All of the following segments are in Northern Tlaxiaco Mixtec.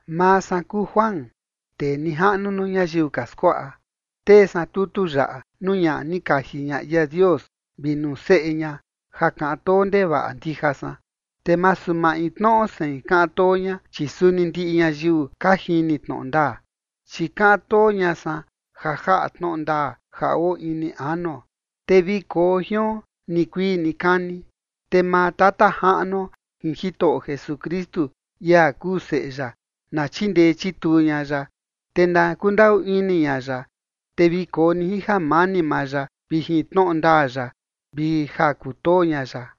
Maa san kuu Juan, tee nijaꞌnu nuu ñayiu ka skuaꞌa, tee san tutu yaꞌa nuu ñaꞌa ni kaji ña ia Dios vi nuu seꞌe ña, ja kaꞌan too ndevaꞌa ndija san, te masu maintnoꞌo sein kaꞌan too ña, chi suni ndiꞌi ñayiu ka jini tnoꞌo ndaa. Chi kaꞌan too ña san ja jaꞌa tnoꞌo ndaa ja oo ini anuo, te vi koo jion nikuii nikani. Te maa Tata Jaꞌnuo jin Jitoꞌo Jesukristu, ia kuu Seꞌe ya, na chindee chituu ña ya, te na kundaꞌu ini ña ya, te vi koo ni jin jamani maa ya vi jin tnoꞌo ndaa ya vi ja kutoo ña ya.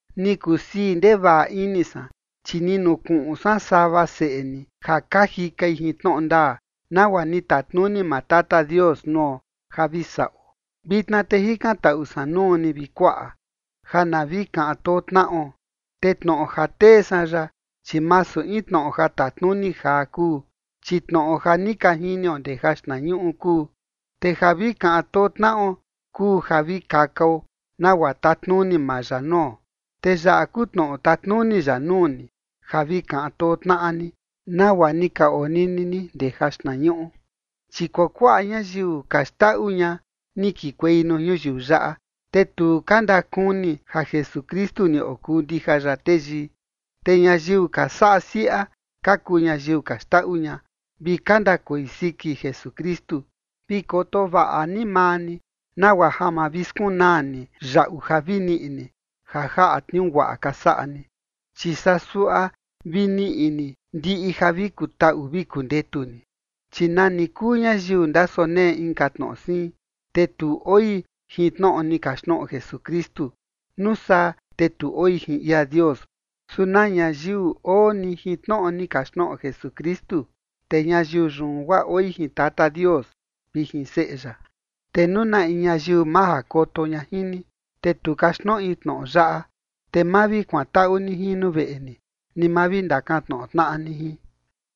Ni kusii ndevaꞌa ini san, chi ni nukuꞌun san sava seꞌe ni ja ka jikai jin tnoꞌo ndaa, nagua ni tatnuni maa Tata Dios nuo ja vi saꞌo. Vitna te jikantaꞌu san nuu ni, vi kuaꞌa, ja na vi kaꞌan too tnaꞌo. Te tnoꞌo ja tee san yaꞌa, chi masu in tnoꞌo ja tatnuni jaa kuu, chi tnoꞌo ja ni ka jinio ndee jaxtnañuꞌu kuu. Te ja vi kaꞌan too tnaꞌo kuu ja vi kakao nagua tatnuni maa ya nuo. Te yaꞌa kuu tnoꞌo tatnuni ya nuu ni: ja vi kaꞌan too tnaꞌa ni, nagua ni ka onini ni ndee jaxtnañuꞌu. Chi kuakuaꞌa ñayiu ka xndaꞌu ña ni kekuei nuu ñuyiu yaꞌa, te tu ka ndakuni ja Jesukristu ni okuu ndija ya teyii. Te ñayiu ka saꞌa siaꞌa ka kuu ñayiu ka xndaꞌu ña vi ka ndakoi siki Jesukristu. Vi koto vaꞌa ni maa ni, nagua ja ma vi skunaa ni yaꞌu ja vi niꞌi ni ja jaꞌa tniuu guaꞌa ka saꞌa ni, chi saa suaꞌa vi niꞌi ni ndiꞌi ja vi kutaꞌu vi kundetu ni. Chi nani kuu ñayiu ndasonee inka tnoꞌo siin, te tu oi jin tnoꞌo ni kaxtnoꞌo Jesukristu, nuu saa te tu oi jin ia Dios. Su na ñayiu oo ni jin tnoꞌo ni kaxtnoꞌo Jesukristu, te ñayiu yun guaa oi jin Tata Dios vi jin Seꞌe ya. Te nuu na in ñayiu majakoto ña jin ni, te tu kaxtnoꞌi tnoꞌo yaꞌa, te ma vi kuantaꞌu ni jin nuu veꞌe ni, ni ma vi ndakantnoꞌo tnaꞌa ni jin.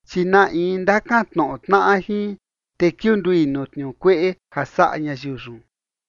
Chi na in ndakantnoꞌo tnaꞌa jin, te kiundui nuu tniuu kueꞌe ja saꞌa ñayiu yun.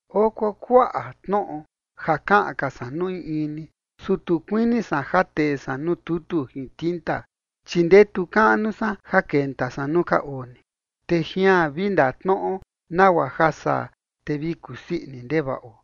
Oo kuakuaꞌa tnoꞌo ja kaꞌan ka san nuu in in ni, su tu kuini san ja tee san nuu tutu jin tinta, chi ndetu kaꞌnu san ja kenta san nuu ka oo ni, te jian vi ndatnoꞌo, nagua ja saa te vi kusii ini ndevaꞌo.